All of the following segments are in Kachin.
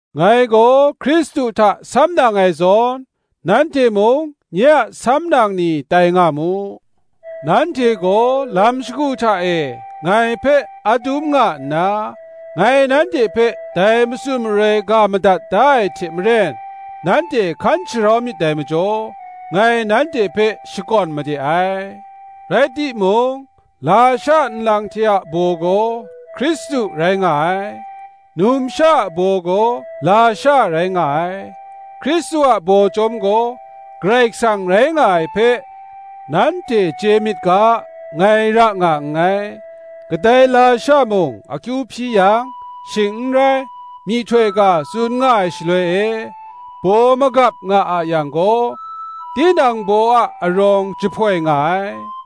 Ngai gaw Hkristu hta samnang ai zawn, nanhte mung nye a samnang ni tai nga mu. Nanhte gaw lam shagu hta e ngai hpe adum nga nna, ngai nanhte hpe dai matsun maroi ga madat da ai hte maren, nanhte hkan sharau myit dai majaw, ngai nanhte hpe shakawn made ai. Rai timung, lasha nlang hte a baw gaw, Hkristu rai nga ai, numsha a baw gaw lasha rai nga ai, Hkristu a baw chyawm gaw, Karai Kasang rai nga ai hpe nanhte chye myit ga, ngai ra nga nngai. Kadai lasha mung akyu hpyi yang, shing n rai, myihtoi ga tsun nga ai shaloi e, baw magap nga a yang gaw, tinang baw a arawng jahpoi nga ai.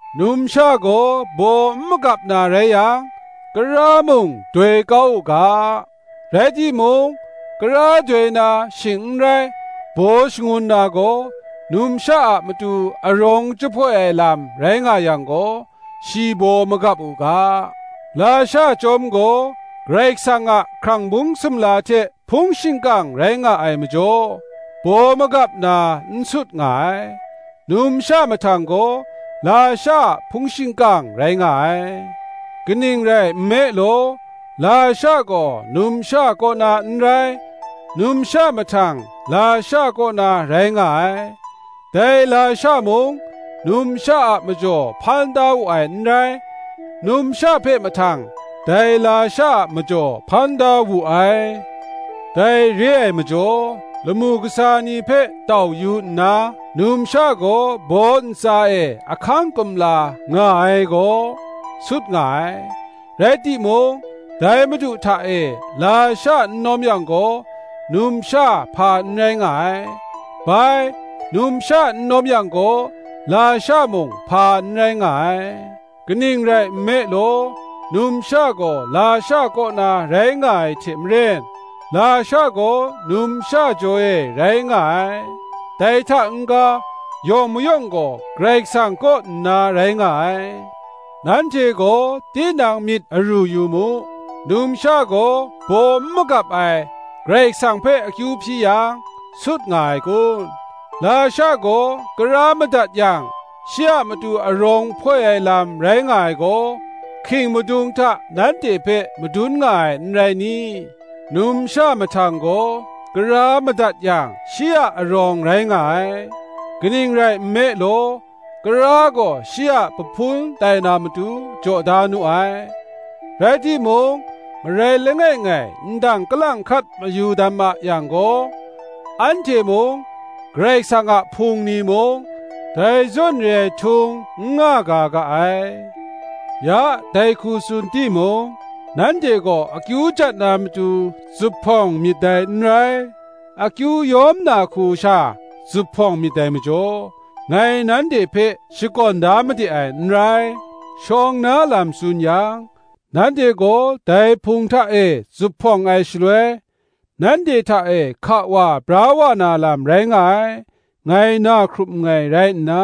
Numsha gaw baw n magap na rai yang, kara mung doi kau u ga; rai timung, kara doi na, shing n rai, baw shangun na gaw, numsha a matu arawng jahpoi ai lam rai nga yang gaw shi baw magap u ga. Lasha chyawm gaw, Karai Kasang a hkrang bung sumla hte hpung shingkang rai nga ai majaw, baw magap na n sut nga ai: numsha mahtang gaw, lasha a hpung shingkang rai nga ai. Kaning rai nme law, lasha gaw numsha kaw na n rai, numsha mahtang lasha kaw na rai nga ai: dai lasha mung, numsha a majaw hpan da wu ai n rai, numsha hpe mahtang, dai lasha a majaw hpan da wu ai. Dai re ai majaw, lamu kasa ni hpe tau yu nna, numsha gaw baw ntsa e ahkang kumla nga ai gaw, sut nga ai. Rai timung, dai Madu hta e, lasha n lawm yang gaw numsha hpa n rai nga ai; bai, numsha n lawm yang gaw lasha mung hpa n rai nga ai; kaning rai nme law, numsha gaw lasha kaw na rai nga ai hte maren, lasha gaw numsha jaw e rai nga ai; dai hta n-ga yawng mayawng gaw Karai Kasang kaw nna rai nga ai. Nanhte gaw tinang myit aru yu mu: numsha gaw baw n magap ai, Karai Kasang hpe akyu hpyi yang, sut nga ai kun? Lasha gaw kara madat yang, shi a matu arawng hpoi ai lam rai nga ai gaw, hking madung hta nanhte hpe madun nga ai n rai ni? Numsha mahtang gaw kara madat yang, shi a arawng rai nga ai; kaning rai nme law, kara gaw shi a pahpun tai na matu, jaw da nu ai. Rai timung, marai langai ngai ndang kalang hkat mayu dam a yang gaw, anhte mung, Karai Kasang a Hpung ni mung, dai zawn re ai htung n nga ga ga ai. Ya dai hku tsun timung, nanhte gaw akyu jat na matu zuphpawng myit dai n rai, akyu yawm na hku sha zuphpawng myit dai majaw, ngai nanhte hpe shakawn da made ai n rai. Shawng na lam tsun yang, nanhte gaw dai Hpung hta e zuphpawng ai shaloi, nanhte hta e hka wa bra wa na lam rai nga ai, ngai na hkrup nngai rai nna,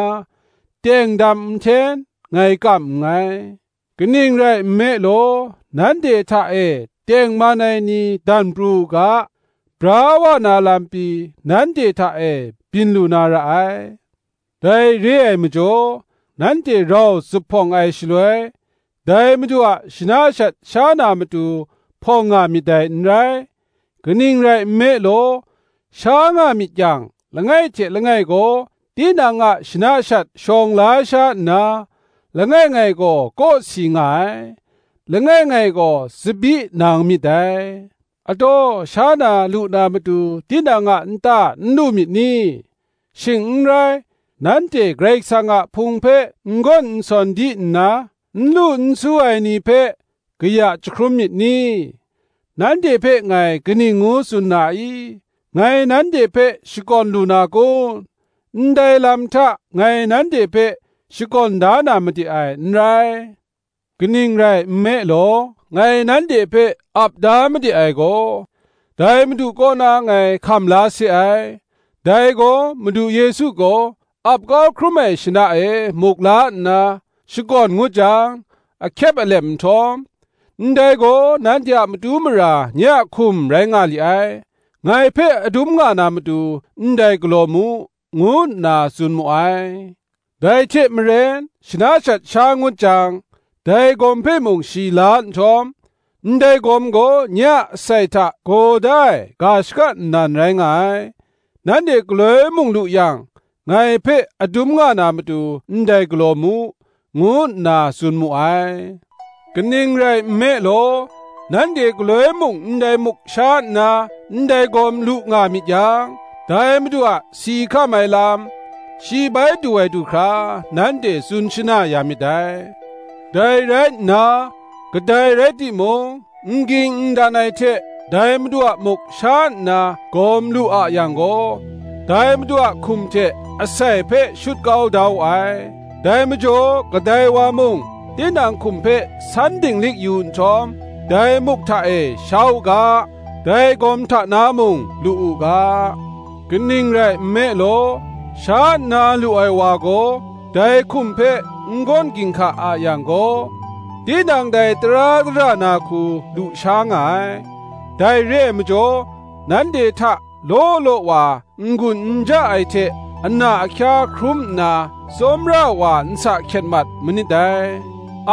teng dam nhten ngai kam nngai. Kaning rai nme law, nanhte hta e tengman ai ni dan pru u ga, bra wa na lam pyi nanhte hta e byin lu na ra ai. Dai re ai majaw, nanhte rau zuphpawng ai shaloi, dai Madu a shana shat sha na matu hpawng nga myit dai n rai: kaning rai nme law, sha nga myit yang, langai hte langai gaw tinang a shana shat shawng la sha nna, langai ngai gaw kawsi nga ai, langai ngai gaw tsabyi nang myit dai. Ataw, sha na lu na matu tinang a nta n lu myit ni? shing n rai, nanhte Karai Kasang a Hpung hpe n gawn n sawn di nna, n lu n su ai ni hpe kaya jahkrum myit ni? Nanhte hpe ngai kaning ngu tsun na i? ngai nanhte hpe shakawn lu na kun? Ndai lam hta ngai nanhte hpe shakawn da na made ai, n rai. Kaning rai nme law, ngai nanhte hpe ap da made ai gaw, dai Madu kaw na ngai hkam la se ai: dai gaw, Madu Yesu gaw ap kau hkrum ai shana e muk la nna, shakawn ngut jang, ahkyep alep nhtawm, “Ndai gaw nanhte a matu mara nye a hkum rai nga li ai; ngai hpe adum nga na matu ndai galaw mu,” ngu nna tsun mu ai. Dai hte maren, shana shat sha ngut jang, dai gawm hpe mung shi la nhtawm, “Ndai gawm gaw nye a asai hta gaw da ai ga shaka nnan rai nga ai; nanhte galoi mung lu yang, ngai hpe adum nga na matu ndai galaw mu,” ngu nna tsun mu ai. Kaning rai nme law, nanhte galoi mung ndai muk sha nna ndai gawm lu nga myit yang, dai Madu a si hkam ai lam, shi bai du ai du hkra, nanhte tsun shana ya myit dai. Dai rai nna, kadai rai timung n ging n dan ai hte dai Madu a muk sha nna gawm lu a yang gaw, dai Madu a hkum hte asai hpe shut kau da wu ai. Dai majaw kadai wa mung tinang hkum hpe san dinglik yu nhtawm, dai muk hta e sha u ga, dai gawm hta na mung lu u ga. Kaning rai nme law, sha nna lu ai wa gaw, dai hkum hpe n gawn ginhka a yang gaw, tinang dai tara dara na hku lu sha nga ai. Dai re ai majaw nanhte hta law law wa n-gun n ja ai hte ana ahkya hkrum nna, tsawmra wa nsa hkyet mat manit dai.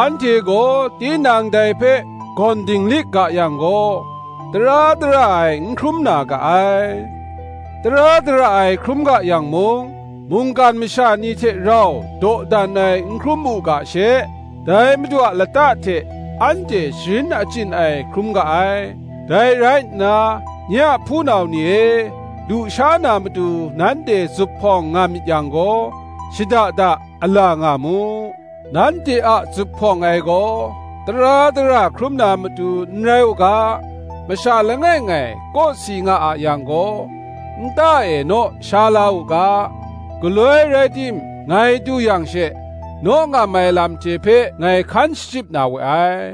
Anhte gaw tinang dai hpe gawn dinglik ga yang gaw, tara dara ai n hkrum na ga ai. Tara dara ai hkrum ga yang mung, mungkan masha ni hte rau dawdan ai n hkrum u ga she, dai Madu a lata hte anhte sharin achyin ai hkrum ga ai. Dai rai nna, nye a hpunau ni e, lu sha na matu nanhte zuphpawng nga myit yang gaw, shada da ala nga mu. Nanhte a zuphpawng ai gaw tara dara hkrum na matu n rai u ga, masha langai ngai kawsi nga a yang gaw, nta e naw sha la u ga. Galoi rai tim ngai du yang she, naw ngam ai lam hte hpe ngai hkan shachyip na we ai.